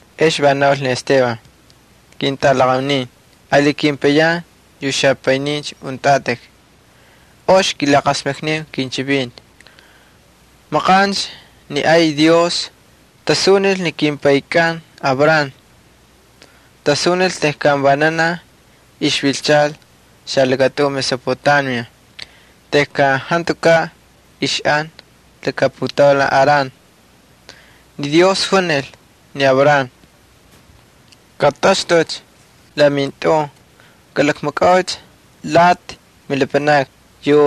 Ex va naul ni Esteban: —Ketꞌalaqaunin ali kepayan yu xapaynincha untꞌatꞌik, ox kilaqasmakniu kinchivinti. Maqancha ni ay Dios tasunil ni kimpaykꞌan Abraham. Tasunil tejkan vananaj ixvilchal xalakatꞌun Mesopotamia tejkan jantukaꞌ ixꞌan laka putaulan Harán. Ni Dios junil ni Abraham: “Katꞌaxtꞌucha la mintꞌun, kꞌalakmakꞌaucha lati milapanakni yu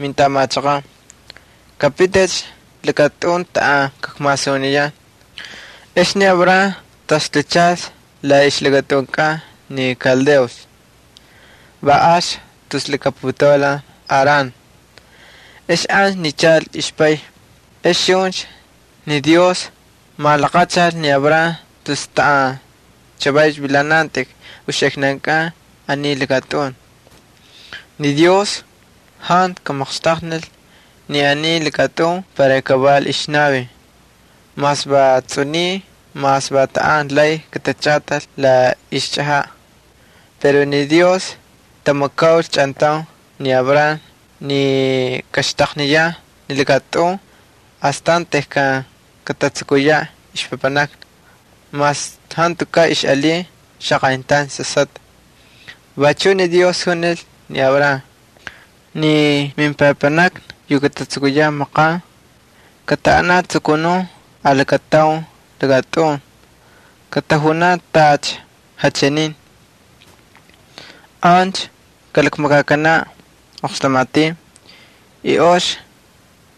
mintꞌamachaqan. Kapiticha lakatꞌun taꞌan kakmasuniyan.” Ex ni Abraham taxtuchalcha la ixlakatꞌunkꞌan ni Kaldeos, va alcha tus laka putaulan Harán. Ex ancha nichal ixpay. Ex chuncha ni Dios malaqachal ni Abraham tus taꞌan chavaycha vilanantꞌik uxiknankꞌan aniy lakatꞌun. Ni Dios jantu kamaqxtaqnil ni aniy lakatꞌun para kaval ixnavin, mas va tsꞌuniy mas va taꞌan lay katachꞌatal la ixchꞌajaꞌ. Pero ni Dios tꞌatamakaul chꞌantaun ni Abraham ni kaxtaqniyaꞌ ni lakatꞌun astan tejkan katatsukuyaꞌ ixpapanakna, mas jantukaꞌ ixꞌalin xaqayntaun sasꞌatꞌa. Vachuꞌ ni Dios junil ni Abraham: “Ni mepapanakna yu katatsukuyaꞌ maqan, kataꞌanaꞌ jatsukunun alakataun lakatꞌun, katajunaꞌ tacha jachinin. Ancha kalakmakakanaꞌ oqxtamatin y ox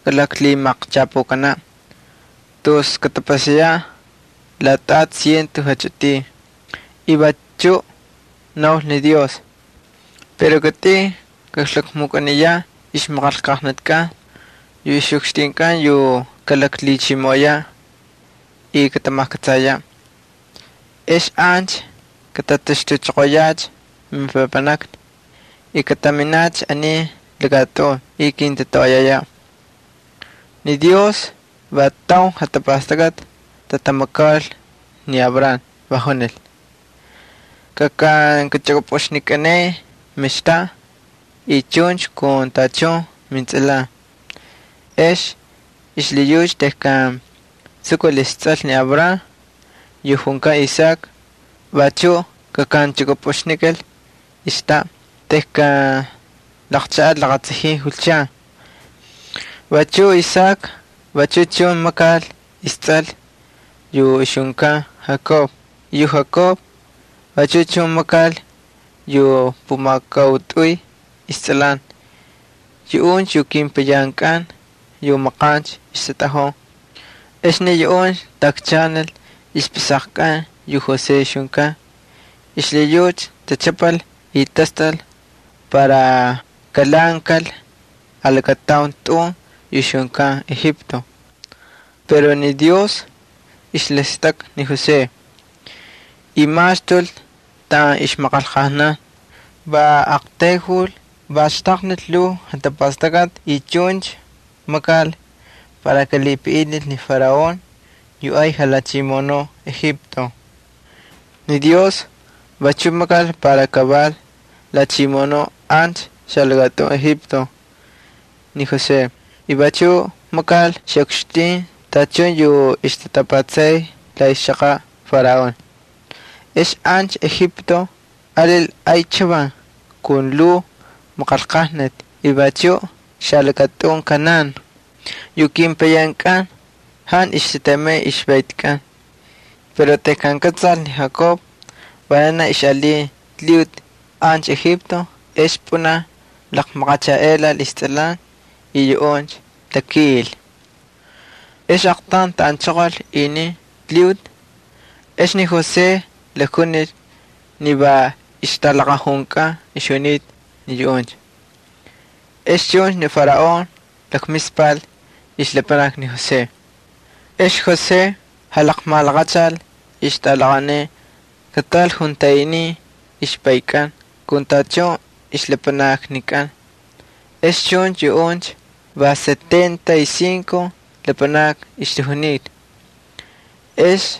kalaqlhimaqchapukanaꞌ tus katapasayaꞌ laꞌatꞌati ciento jachꞌitin.” Vachuꞌ naul ni Dios: “Pero kitꞌin kaklakmukꞌaniyaꞌ ixmaqanlqajnatikꞌan yu ixꞌukxtinkꞌan yu kalaklhichimoꞌoyaꞌ, y katamajkꞌatsayaꞌ. Ex ancha katataxtuchoqoyacha mepapanakna y kataminacha aniy lakatꞌun y kintatoꞌoyayaꞌ.” Ni Dios va taun jatapastakꞌati tꞌatamakaul ni Abraham, va junil: “Kaxvililichꞌukꞌupꞌuxnikꞌaneꞌe mextaꞌa y chuncha kun tachun mintsꞌalan.” Ex xlhiyucha tejkan tsukul istsꞌal ni Abraham yu ixjunkan Isaac, vachuꞌ xvililichukꞌupꞌuxnil xaxtaꞌa tejkan laqchaꞌal laqatsajin julchan. Vachuꞌ Isaac vachu chun makanil istsꞌal yu ixjunkan Jacob y yu Jacob vachu chun makanil yu pumakautꞌuy istsꞌalan. Yuꞌuncha yu kepayankꞌan yu maqancha ixtatꞌajun. ’Ex ni yuꞌuncha taꞌakchaꞌanil ixpꞌisaqakꞌan yu José ixjunkan. Xlhiyucha tachꞌapal y tastꞌal para kalhaꞌankal alakataun tꞌun yu ixjunkan Egipto. Pero ni Dios ixlhistakꞌa ni José y maxtul taꞌan ixmaqanlqajnan. Va aqtayjul, va xtaqnil lhuu jatapastakꞌati y chuncha makal para kalhipaꞌinil ni Faraón yu ay jalhachimoꞌonuꞌ Egipto. Ni Dios vachuꞌ makal para kaval lhachimoꞌonuꞌ ancha xalakatꞌun Egipto ni José y chuncha makal xaꞌukxtin tachun yu ixtatapatsay la ixchaqaꞌ Faraón. Ex ancha Egipto alil ay chavan kun lhuu maqanlqajnati y vachuꞌ xalakatꞌun Canaán. Yu kepayankꞌan jantu ixtatemay ixvaytikꞌan. Pero tejkan kꞌatsal ni Jacob vananaj ixꞌalin lhiꞌuti ancha Egipto ex pꞌunaj laqmalaqachaꞌelal istsꞌalan y yuꞌuncha takiꞌil. Ex aqtaun taꞌanchoqol inin lhiꞌuti. Ex ni José jalakjunil ni va ixtꞌalaqajunkꞌan ixjunita ni yuꞌuncha. Ex chuncha ni Faraón lakmispal ixlapanakni ni José. Ex ni José jalaqmalaqachal ixtꞌalaqaunin kataꞌal juntaꞌinin ixpaykꞌan kun tachun ixlapanaknikꞌan. Ex chuncha yuꞌuncha va setenta y cinco lapanakni ixtajunita. Ex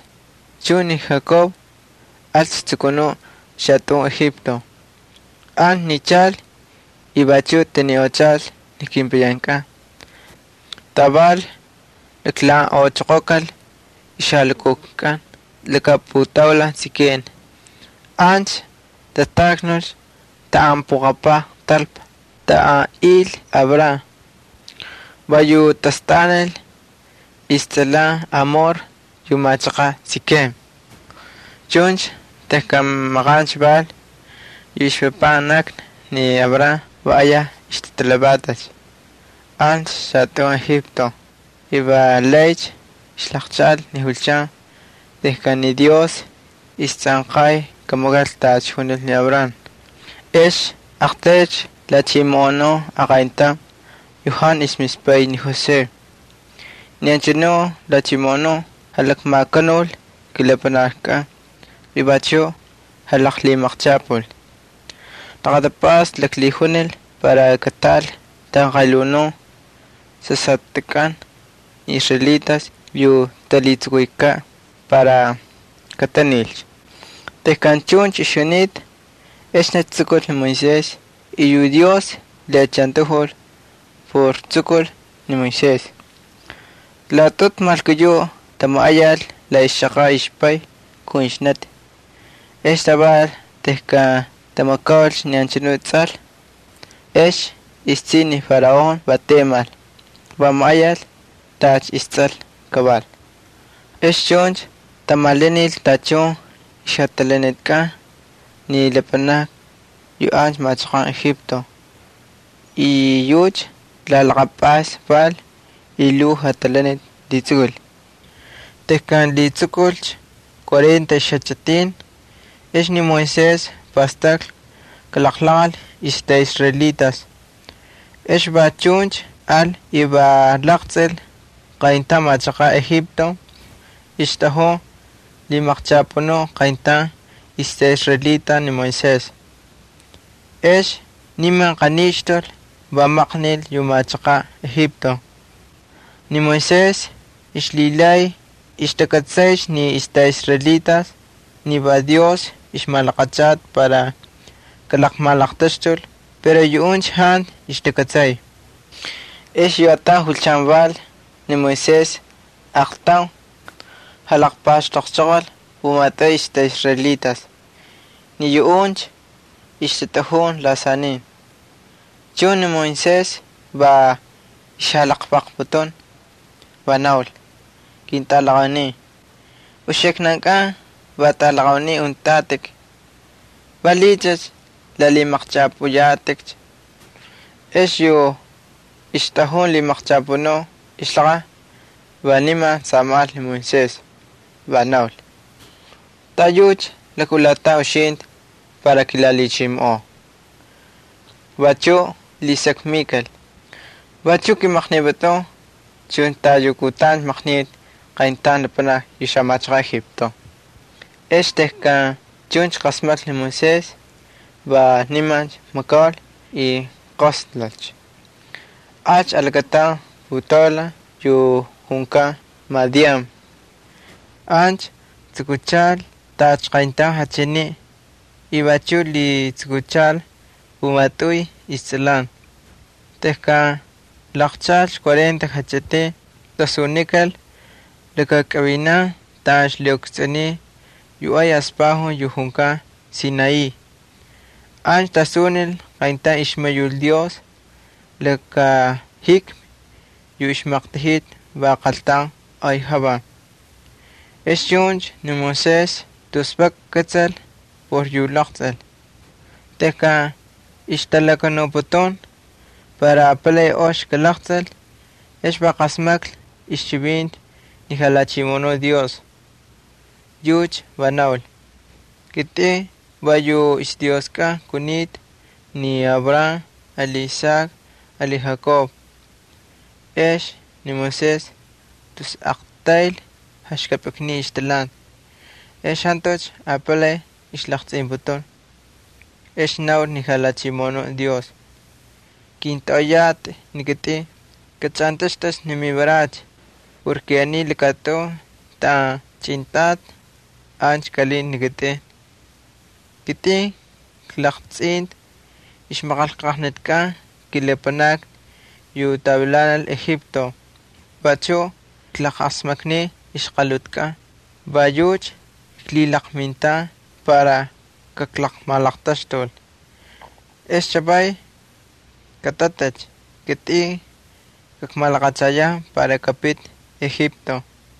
chuncha ni Jacob alcha jatsukunuꞌ xalakatꞌun Egipto. Ancha nichal y vachuꞌ taniꞌochal ni kepayankꞌan. Taval laklhaꞌanꞌochoqokal ixjalukutkꞌan laka putaulan Sikem. Ancha tataknul taꞌan puqapaj talpa taꞌan il Abraham, va yu tastꞌanil istsꞌalan Hamor yu machaqan Sikem. ’Chuncha tejkan maqancha val, yu ixpapanakna ni Abraham va ayaj ixtatalhavatacha ancha xalakatꞌun Egipto y valaycha ixlaqchaꞌal ni julchan tejkan ni Dios istsꞌanqay kamakal tacha junil ni Abraham. Ex aqtaylcha lhachimoꞌonun aqayntaun yu jantu ixmispay ni José. Ni anchanu lhachimoꞌonuꞌ jalakmakanul kilapanaknikꞌan y vachuꞌ jalaqlhimaqchapul. Laqatapꞌasta laklhijunil para kataꞌal tanqalhunun sasꞌatꞌankꞌan ni israelitas yu talhitsukuykaꞌ para katanilcha. Chuncha tejkan chuncha ixjunita, exnicha tsukul ni Moisés y yu Dios lhiꞌachantajul por tsukul ni Moisés. Laꞌatꞌutu malkuyuꞌ tamaꞌayal la ixchaqaꞌ ixpay kun ixnati. Ex taval tejkan tamakaulcha ni anchanu tsꞌal, ex istsiꞌi ni Faraón va temal, va maꞌayal tacha istsꞌal kaval. Ex chuncha tamalanil tachun ixjatalanitkꞌan ni lapanakni yu ancha machaqan Egipto. La laqapꞌasni val y lhuu jatalaniti lhitsukul. ’Tejkan lhitsukulcha cuarenta ixjachꞌitin ex ni Moisés pastaklhi kalaqlaqꞌal ixtꞌaꞌisraelitas. Ex va chuncha al y va laqtsꞌil qayntaun machaqaꞌ Egipto ixtꞌajun lhimaqchapunuꞌ qayntaun ixtꞌaꞌisraelita ni Moisés. Ex niman aqanixtul, va maqnil yu machaqaꞌ Egipto. Ni Moisés ixlhilay ixtakꞌatsaycha ni ixtꞌaꞌisraelitas ni va Dios ixmalaqachata para kalaqmalaqtaxtul pero yuꞌuncha jantu ixtakꞌatsay. Ex yu ataun julchan val ni Moisés aaqtaun jalaqpaxtoqchoqol pumatꞌuy ixtꞌaꞌisraelitas. Ni yuꞌuncha ixtatꞌajun lasanin. Chuncha ni Moisés va ixjalaqlvaqputun, va naul: “Ketꞌalaqaunin, uxiknankꞌan va tꞌalaqaunin untꞌatꞌik. ¿Valiꞌiycha lalhimaqchꞌapꞌuyatꞌikcha?” Ex yu ixtꞌajun lhimaqchapunuꞌ ixlaqaj va niman samajꞌal ni Moisés, va naul: “¿Taꞌayucha lakꞌulatan uxintꞌi para kilalhichimoꞌoo?” Vachuꞌ lhisakmikal: “¿Vachuꞌ kꞌimaqnipꞌutꞌun chuncha tacha yu kutancha maqnitꞌi qayntaun lapanaki yu machaqaꞌ Egipto?” Ex tejkan chuncha qasmaklhi ni Moisés, va limancha makaul y jaqosnulcha, alcha alakataun putaulan yu junkan Madián. Ancha tsukuchalcha taꞌan jantu machaqaꞌ kaval y vachuꞌ lhitsukuchal pumatꞌuy istsꞌalan. ’Tejkan laqchaꞌalcha cuarenta jachꞌitin, tasunikal lakakꞌavinan taꞌan ixlhiꞌukstsꞌuniy yu ay aspajun yu junkan Sinaí, ancha tasunil qayntaun ixmayul Dios laka jikmi yu ixmaqtajita va qaltaun yu ay javan. Ex chuncha ni Moisés tus vak kꞌatsal por yu laqtsꞌil. Tejkan ixtalakanuputun para apalay ox kalaqtsꞌil ex va qasmaklhi ixchivinti ni Jalhachimoꞌonuꞌ Dios. Yucha va naul: “Kitꞌin va yu ixDioskꞌan kunita ni Abraham ali Isaac ali Jacob.” Ex ni Moisés tus aqtayl jaxkapꞌiknin ixtalhanti, ex jantucha apalay ixlaqtsꞌinputun. Ex naul ni Jalhachimoꞌonuꞌ Dios: “Kintꞌoꞌoyatꞌi ni kitꞌin, kachꞌantꞌaxtꞌucha ni mivarachi. Aniy lakatꞌun taꞌan chꞌintꞌatꞌa ancha kꞌalinta ni kitꞌin. Kitꞌin klaqtsꞌinta ixmaqanlqajnatikꞌan kilapanakni yu tavilanal Egipto y vachuꞌ klajqasmakniy ixqalhutikꞌan. Va yucha klhilaqmintan para kajkamalaqtaxtul. Ex chavay, katꞌatꞌicha. Kitꞌin kakmalaqachayan para kapiti Egipto.”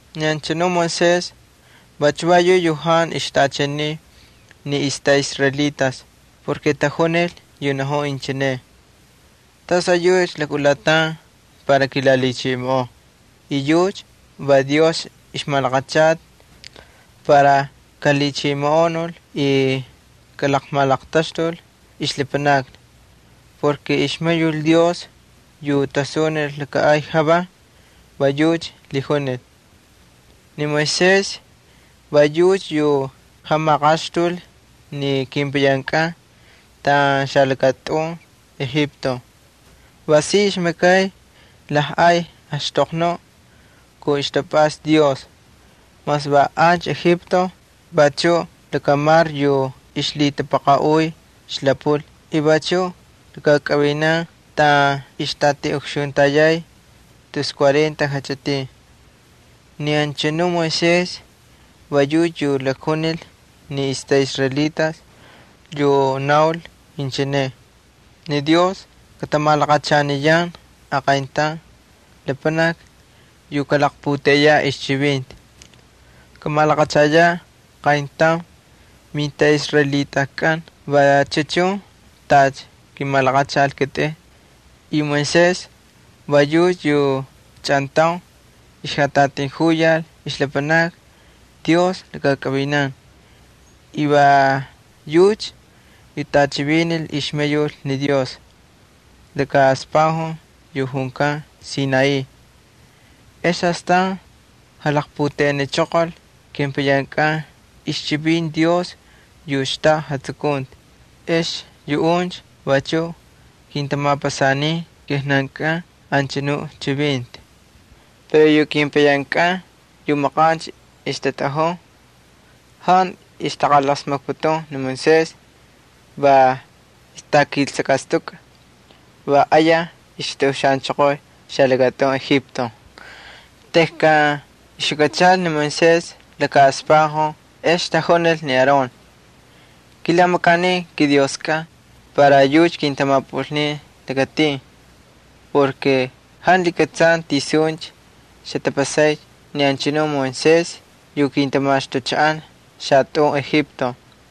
’Ni anchanu Moisés vachu va yuꞌ yu jantu ixtaꞌachaniy ni ixtꞌaꞌisraelitas por tajunil yu najun inchine: “¿Tasꞌayucha lakꞌulatan para kilalhichimoꞌoo?” Yucha va Dios ixmalaqachata para kalhachimoꞌonul y kamalaqtaxtul ixlapanakni, por ixmayul Dios yu tasunil laka ay javan va yucha lhijunil. Ni Moisés va yucha yu jamaqaxtul ni kepayankꞌan taꞌan xalakatꞌun Egipto. Va si ixmakay lajꞌay axtoqnuꞌ kun ixtapꞌasta Dios, mas va ancha Egipto y vachuꞌ lakamar yu ixlhitapaqaꞌuy Xlapul y vachuꞌ ali lakakꞌavinan taꞌan ixtatiꞌukxuntayay tus cuarenta jachꞌitin. Ni anchanuꞌ Moisés va yucha yu lakjunil ni ixtꞌaꞌisraelitas, yu naul inchine: “Ni Dios katamalaqachaniyan aqayntaun lapanaki yu kalaqputeꞌeyaꞌ ixchivinti. Kamalaqachayaꞌ qayntaun mintꞌaꞌisraelitakꞌan vachu chun tacha kimalaqachal ni kitꞌin.” Moisés va yucha yu chꞌantaun ixjatꞌatijuyal ixlapanakni Dios lakakꞌavinan y va yucha yu tꞌachivinil ixmayul ni Dios laka aspajun yu junkan Sinaí. Ex astan jalaqputeꞌenichoqol kepayankꞌan ixchivinti Dios yu xtaꞌa jatsukunti. Ex yuꞌuncha vachuꞌ kintamapasanin kijnankꞌan anchanu chivinti. ’Pero yu kepayankꞌan yu maqancha ixtatꞌajun jantu ixtaqalasmakputun ni Moisés, va ixtakiltsꞌakꞌastukꞌa, va ayaj ixtaꞌuxaꞌanchoqoy xalakatꞌun Egipto. Tejkan ixjukꞌachal ni Moisés laka aspajun ex tajunil ni Aarón: “Kilamakaniu kidioskꞌan para yucha kintamapꞌulnin lakatin. Jantu lhikꞌatsan tisuncha xatapasay ni anchanu Moisés yu kintamaxtuchaꞌan xalakatꞌun Egipto.”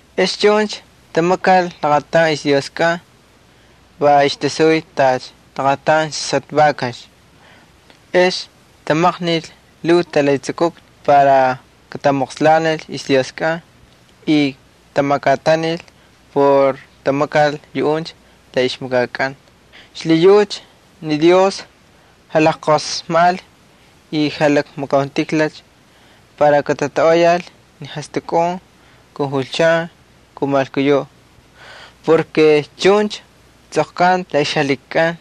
Ex chuncha tamakal laqataun ixdioskꞌan, va ixtasuy tacha laqataun sasꞌatꞌa vakax. Ex tamaqnil lhuu talhitsukukna para katamoqslanil ixdioskꞌan y tamakꞌatanil por tamakal yuꞌuncha la ixmakakꞌan. Xlhiyucha ni Dios jalajqosmajꞌalcha y jalakmakauntijlalcha para katatoꞌoyal ni jastꞌakun kun julchan kun malkuyuꞌ. Chuncha tsꞌoqkanta la ixjalhikikꞌan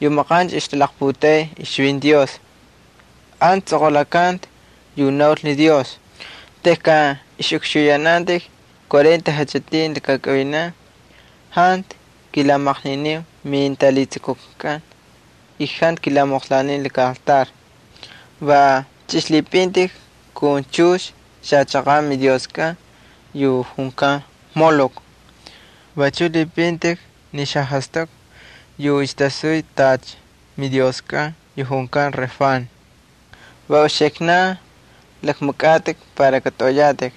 yu maqancha ixtalaqputeꞌey ixchivinti Dios. Ancha tsꞌoqꞌulakanta yu naul ni Dios: Uxiknan yu israelitas untꞌatꞌik, tejkan ixꞌukxuyanantꞌik cuarenta jachꞌitin lakakꞌavinan, jantu kilamaqniniu mintalhitsukutkꞌan y jantu kilamoqslaniu laka altar. Va chꞌixlhipꞌintꞌik kun chux xachaqaꞌ midioskꞌan yu junkan Molok. Vachuꞌ lhipꞌintꞌik ni xajastꞌaku yu ixtasuy tacha midioskꞌan yu junkan Refán. Va uxiknan lakmakꞌatꞌik para katꞌoꞌoyatꞌik.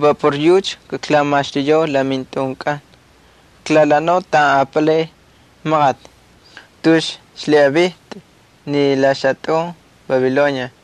Va por yucha kaklamaxtuyau la mintꞌunkꞌan. Kaklalhaꞌanau taꞌan apalay maqati, tus xlhiꞌavintꞌi xalakatꞌun Babilonia.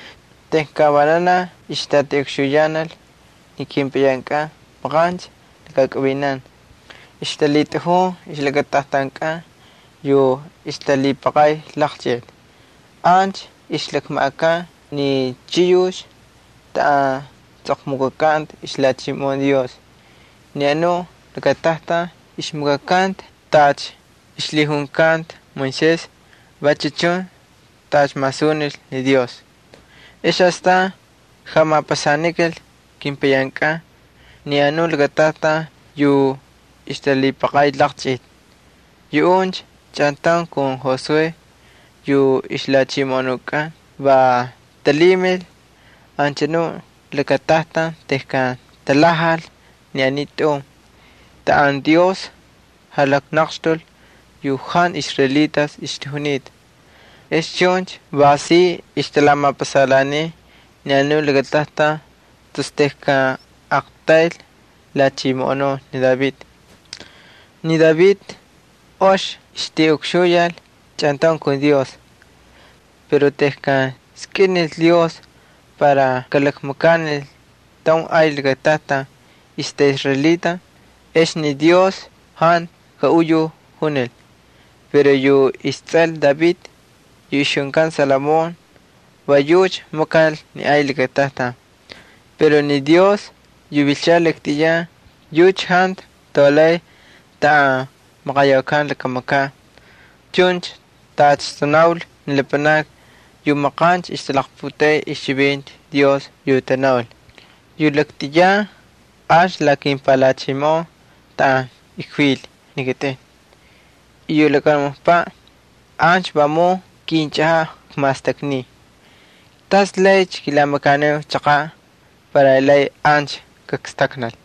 ’Tejkan vananaj ixtatiꞌukxuyanal ni kepayankꞌan maqancha lakakꞌavinan, ixtalhitꞌajun ixlakatajtankꞌan yu ixtalhipaqay laqchꞌiti. Ancha ixlakmaꞌakan ni chiyux taꞌan tsꞌoqmukꞌakanta ixlhachimoꞌon Dios. Ni anu lakatajtan ixmakakanta tacha ixlhijunkanta Moisés, vachu chun tacha masunil ni Dios. Ex astan jamapasanikal kepayankꞌan ni anu lakatajtan yu ixtalhipaqay laqchꞌiti. Yuꞌuncha chꞌantaun kun Josué yu ixlhachimoꞌonukꞌan va talhimil anchanu lakatajtan tejkan talhajal ni aniy tꞌun taꞌan Dios jalaqnaqxtul yu jantu israelitas ixtajunita. Ex chuncha va si ixtalamapasalhaaniy ni anu lakatajtan tus tejkan aqtayl lhachimoꞌonun ni David. Ni David ox ixtiꞌukxuyal chꞌantaun kun Dios. Pero tejkan skꞌinil Dios para kamakanil taun ay lakatajtan ixtꞌaꞌisraelitas ex ni Dios jantu kaꞌuyujunil. Pero yu istsꞌal David yu ixjunkan Salomón va yucha makal ni ay lakatajtan. Pero ni Dios yu vilchal laktꞌiyan yucha jantu taulay taꞌan maqayaukan laka makaꞌ. Chuncha tacha tanaul ni lapanakni yu maqancha ixtalaqputeꞌey ixchivinti Dios yu tanaul: Yu laktꞌiyan ancha la kimpalhachimoꞌon taꞌan kvil ni kitꞌin, yu lakamunukpaꞌ ancha vamun kinchꞌajaꞌ kmastakniy. ¿Tas laycha kilamakaniu chaqaꞌ para lay ancha kakstaknal?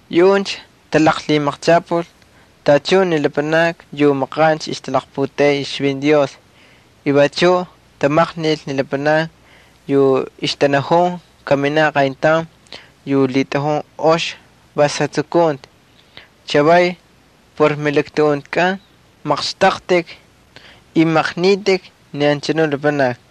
’Yuꞌuncha talaqlhimaqchapul tachun ni lapanakni yu maqancha ixtalaqputeꞌey ixchivinti Dios. Vachuꞌ tamaqnil ni lapanakni yu ixtanajun kaminaꞌ aqayntaun yu lhitꞌajun ox vas jatsukunti. Chavaycha por melaktuꞌuntikꞌan maqxtꞌaqtꞌik y maqnitꞌik ni anchanuꞌ lapanaki.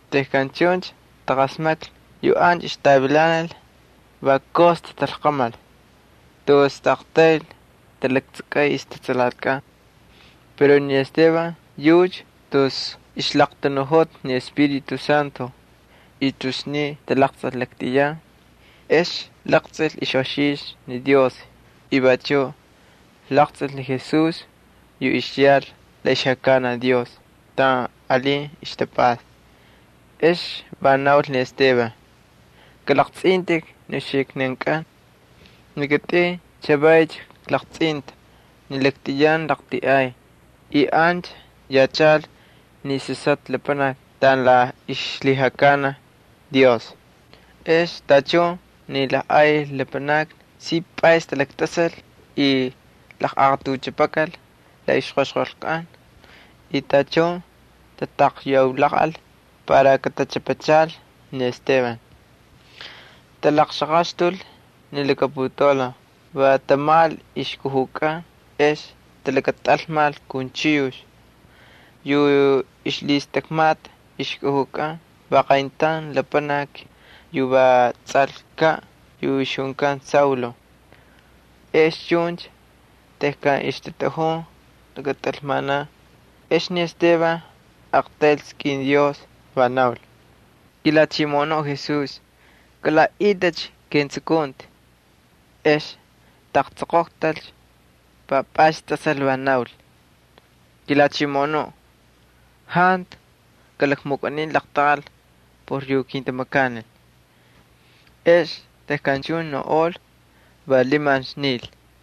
Tejkan chuncha taqasmaklhi yu ancha ixtavilanal va ayaj tatalqamal, tus taꞌaqtayl talaktsakꞌay ixtatsalatikꞌan. Pero ni Esteban yucha tus ixlaqtanuꞌojota ni Espíritu Santo, y tus sniy talaqstꞌal laktꞌiyan. Va laqtsꞌil ixꞌoxixtu ni Dios y vachuꞌ laqtsꞌil ni Jesús yu ixyal la ixlhijakanaj Dios taꞌan alin ixtapꞌasta. Ex va naul ni Esteban: —¡Kꞌalaqtsꞌintꞌik ni uxiknankꞌan! Ni kitꞌin chavaycha klaqtsꞌinta ni laktꞌiyan laqltiꞌay y ancha yachal ni Sasꞌatꞌa Lapanaki taꞌan la ixlhijakanaj Dios. Ex tachun ni lajꞌay lapanakni si pꞌays talaktꞌasal y laqꞌaqatuchꞌapakal la ixꞌaqaxqolkꞌan y tachun tatakyaulaqꞌal para katachꞌapachal ni Esteban. Talaqxaqaxtul ni laka putaulan, va tamajꞌal ixkujukꞌan ex talakatꞌalmal kun chiyux. Yu ixlhistakmata ixkujukꞌan va qayntaun lapanaki yu va tsꞌalkaꞌ yu ixjunkan Saulo. Ex chuncha tejkan ixtatꞌajun lakatꞌalmanan ex ni Esteban aqtayl skꞌin Dios, va naul: —KiJalhachimoꞌonuꞌ Jesús, kalaꞌaꞌitꞌicha ketsukunti. Ex taqtsoqoqtalcha, va pꞌays tꞌasal, va naul: —KiJalhachimoꞌonuꞌ, jantu kꞌalakmukꞌanin laqtaqal por yu kintamakanil. Ex tejkan chuncha naunꞌol va limancha nil.